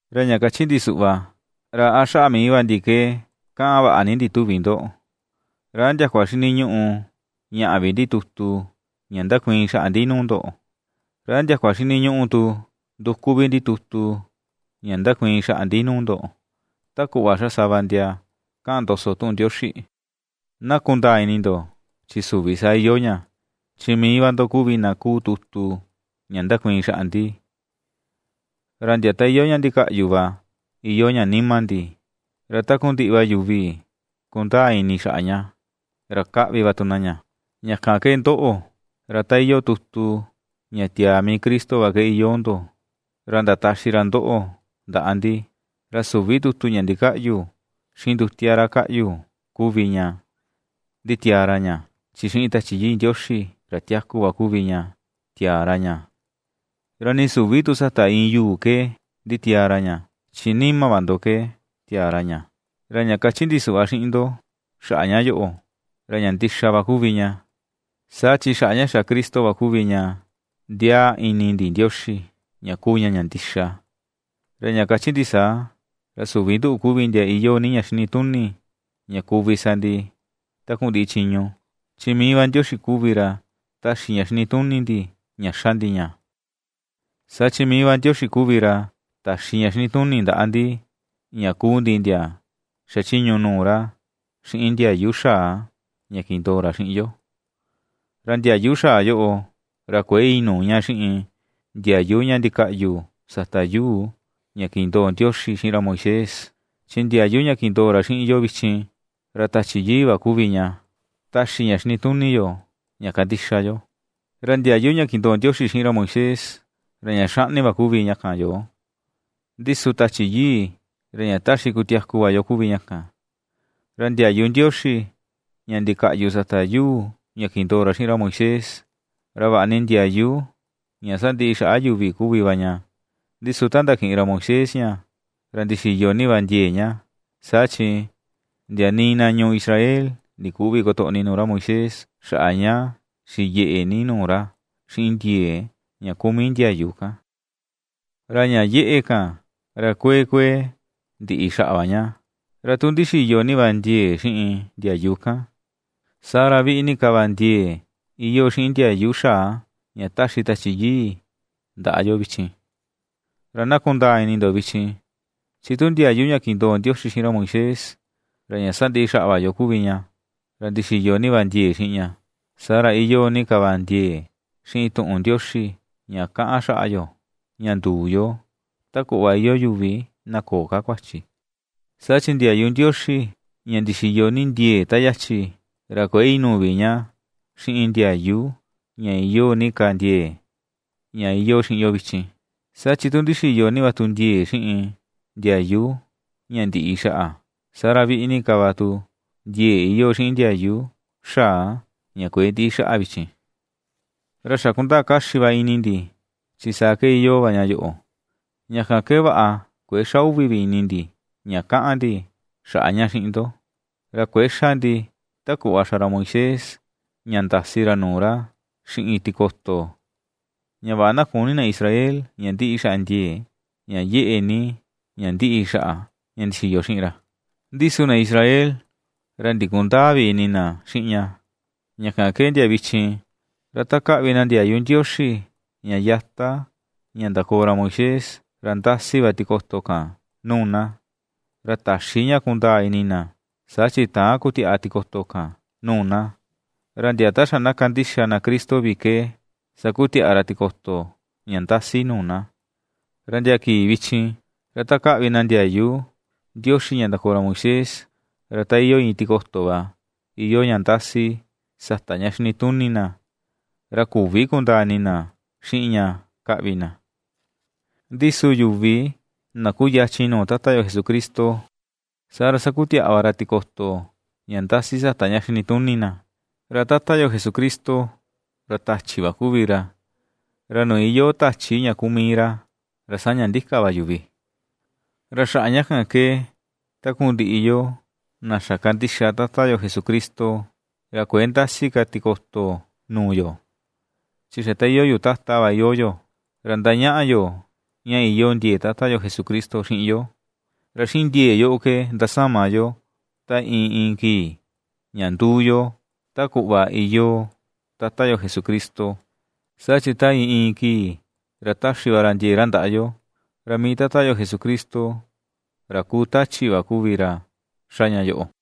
Ra ña kachi ndi suꞌva, ¿ra a xaꞌa mii va ndi ke kaꞌan vaꞌa ni ndi tuvi ndo? ¿Ra a ndiakua xiniñuꞌu ^ñaꞌa vi ndi tutu ña ndakuiin xaꞌa ndi nuu ndo? ¿Ra a ndiakua xiniñuꞌu tu nduku vi ndi tutu ña ndakuiin xaꞌa ndi nuu ndo, ta kuꞌva ^xa sava ndia kaꞌan ndoso tuꞌun Ndioxi? Na kundaa ini ndo, chi süvi saa iyoo ña, chi mii va ndo kuvi na kuu tutu ña ndakuiin xaꞌa ndi; ra ndia ta iyoo ña ndikaꞌyu va iyoo ña nima ndi, ra takundiꞌi va yuvi ^kundaa ini xaꞌa ña, ra ^kaꞌvi va tu na ña. Ña kan ke ndoꞌo, ra ta iyoo tutu ña tiaa mii Cristo va ke iyoo ndo, ra ndataxi ra ndoꞌo ndaꞌa ndi. Ra süvi tutu ña ndikaꞌyu xiꞌin ndutia ra kaꞌyu kuvi ña nditiaa ra ña, chi xiꞌin Tachi Yii Ndioxi, ra tiaku va kuvi ña tiaa ra ña; ra nii süvi tu sata iin yuu ke nditiaa ra ña, chi nima va ndo ke tiaa ra ña. Ra ña kachi ndi suꞌva xiꞌin ndo xaꞌa ña yoꞌo, ra ña ndixa va kuvi ña, saa chi xaꞌa ña xa Cristo va kuvi ña ndiaa ini ndi Ndioxi, ña kuu ña ña ndixa. Ra ña kachi ndi saa, ra süvi nduꞌu kuvi ndia iyoo ni ña xinituni ña kuvi sa ndi takundiꞌi chiñu; chi mii va Ndioxi kuvi ra ^taxi ña xinituni ndi ña ^xa ndi ña. Saa chi mii va Ndioxi kuvi ra ta̱xi ña xinituni ndaꞌa ndi ña kuu ndi ndia ^xachiñu nuu ra xiꞌin ndiayu xaa ña kindoo ra xiꞌin yo. Ra ndiayu xaa yoꞌo, ra kuëe inuu ña xiꞌin ndiayu ña ndikaꞌyu sata yuu ña kindoo Ndioxi xiꞌin ra Moisés, chi ndiayu ña kindoo ra xiꞌin yo vichin, ra Tachi Yii va kuvi ña taxi ña xinituni yo ña kandixa yo. Ra ndiayu ña kindoo Ndioxi xiꞌin ra Moisés ra ña xaꞌni va kuvi ña kan yoo, ndi su Tachi Yii, ra ña taxi kutiaku va yo kuvi ña kan. Ra ndiayu Ndioxi ña ndikaꞌyu sata yuu ña kindoo ra xiꞌin ra Moisés, ra vaꞌa ni ndiayu ña sandiꞌi xaꞌa yuvi kuvi va ña, ndi su ta ndakiꞌin ra Moisés ña ra ndixiyo ni va ndiee ña, saa chi ndia nii na ñuu Israel ndiküvi kotoꞌni nuu ra Moisés xaꞌa ña xiyeꞌe ni nuu ra xiꞌin ndiee ña kuu mii ndiayu kan. Ra ña yeꞌe kan, ra kuee kuee ndiꞌi xaꞌa va ña. Ra tu ndixiyo ni va ndiee xiꞌin ndiayu kan, saa ra viꞌi ni ka va ndiee iyoo xiꞌin ndiayu xaa ña ^taxi Tachi Yii ndaꞌa yo vichin. Ra na kundaa ini ndo vichin, chi tu ndiayu ña kindoo Ndioxi xiꞌin ra Moisés, ra ña sandiꞌi xaꞌa va yo kuvi ña, ra ndixiyo ni va ndiee xiꞌin ña, ¡saa ra iyoo ni ka va ndiee xiꞌin tuꞌun Ndioxi ña kaꞌan xaꞌa yo, ña nduu yo, ta kuꞌva iyoo yuvi na köo ka kuachi! Saa chi ndiayu Ndioxi ña ndixiyo ni ndiee ta yachi, ra kuëe inuu vi ña xiꞌin ndiayu ña iyoo ni ka ndiee, ña iyoo xiꞌin yo vichin. Saa chi tu ndixiyo ni va tu ndiee xiꞌin ndiayu ña ndiꞌi xaꞌa, saa ra viꞌi ni ka va tu ndiee iyoo xiꞌin ndiayu xaa ña kuëe ndiꞌi xaꞌa vichin. Ra xa kundaa kaxi va ini ndi, chi saa ke iyoo va ña yoꞌo, ña kan ke vaꞌa kuëe xa uvi ini vi ndi ña kaꞌan ndi xaꞌa ña xiꞌin ndo. Ra kuëe ^xa ndi, ta kuꞌva xa ra Moisés ña ndasi ra nuu ra xiꞌin tikoto, ña vaꞌa na küni na Israel ña ndiꞌi xaꞌa ndiee, ña yeꞌe ni ña ^ndiꞌi xaꞌa, ña ndixiyo xiꞌin ra. Ndi su na Israel ra ndikundäa vi ini na xiꞌin ña, ña kan ke ndia vichin, ra ta kaꞌvi na ndiayu Ndioxi ña yata ña ndakoo ra Moisés, ra ndasi va tikoto kan nuu na, ra täxi ña kundaa ini na, saa chi täan kutiaꞌa tikoto kan nuu na, ra ndia ta xa na kandixa na Cristo vi ke sakutiaꞌa ra tikoto ña ndasi nuu na. Ra ndia kii vichin, ra ta kaꞌvi na ndiayu Ndioxi ña ndakoo ra Moisés, ra ta iyoo iin tikoto va iyoo ña ndasi sata ña xinituni na, ra küvi kundaa ini na xiꞌin ña kaꞌvi na. Ndi su yuvi na kuyachin nuu Tata yo Jesucristo, saa ra sakutiaꞌa va ra tikoto ña ndasi sata ña xinituni na. Ra Tata yo Jesucristo, ra Tachi va kuvi ra, ra nuu iyoo Tachi ña kuu mii ra, ra saña ndika va yuvi. Ra xaꞌa ña kan ke takundiꞌi yoo na xa kandixa Tata yo Jesucristo, ra kuëe ndasi ka tikoto nuu yo, chi xa ta iyoo yuu tata va iyoo yo, ra ^ndañaꞌa yo ña iyoo ndiee Tata yo Jesucristo xiꞌin yo; ra xiꞌin ndiee yoꞌo ke ^ndasama yo ta iin iin kii, ña ^nduu yo ta kuꞌva iyoo Tata yo Jesucristo, saa chi ta iin iin kii ra ^taxi va ra ndiee ra ndaꞌa yo. Ra mii Tata Jesucristo ra kuu Tachi va kuvi ra ^xa ña yoꞌo.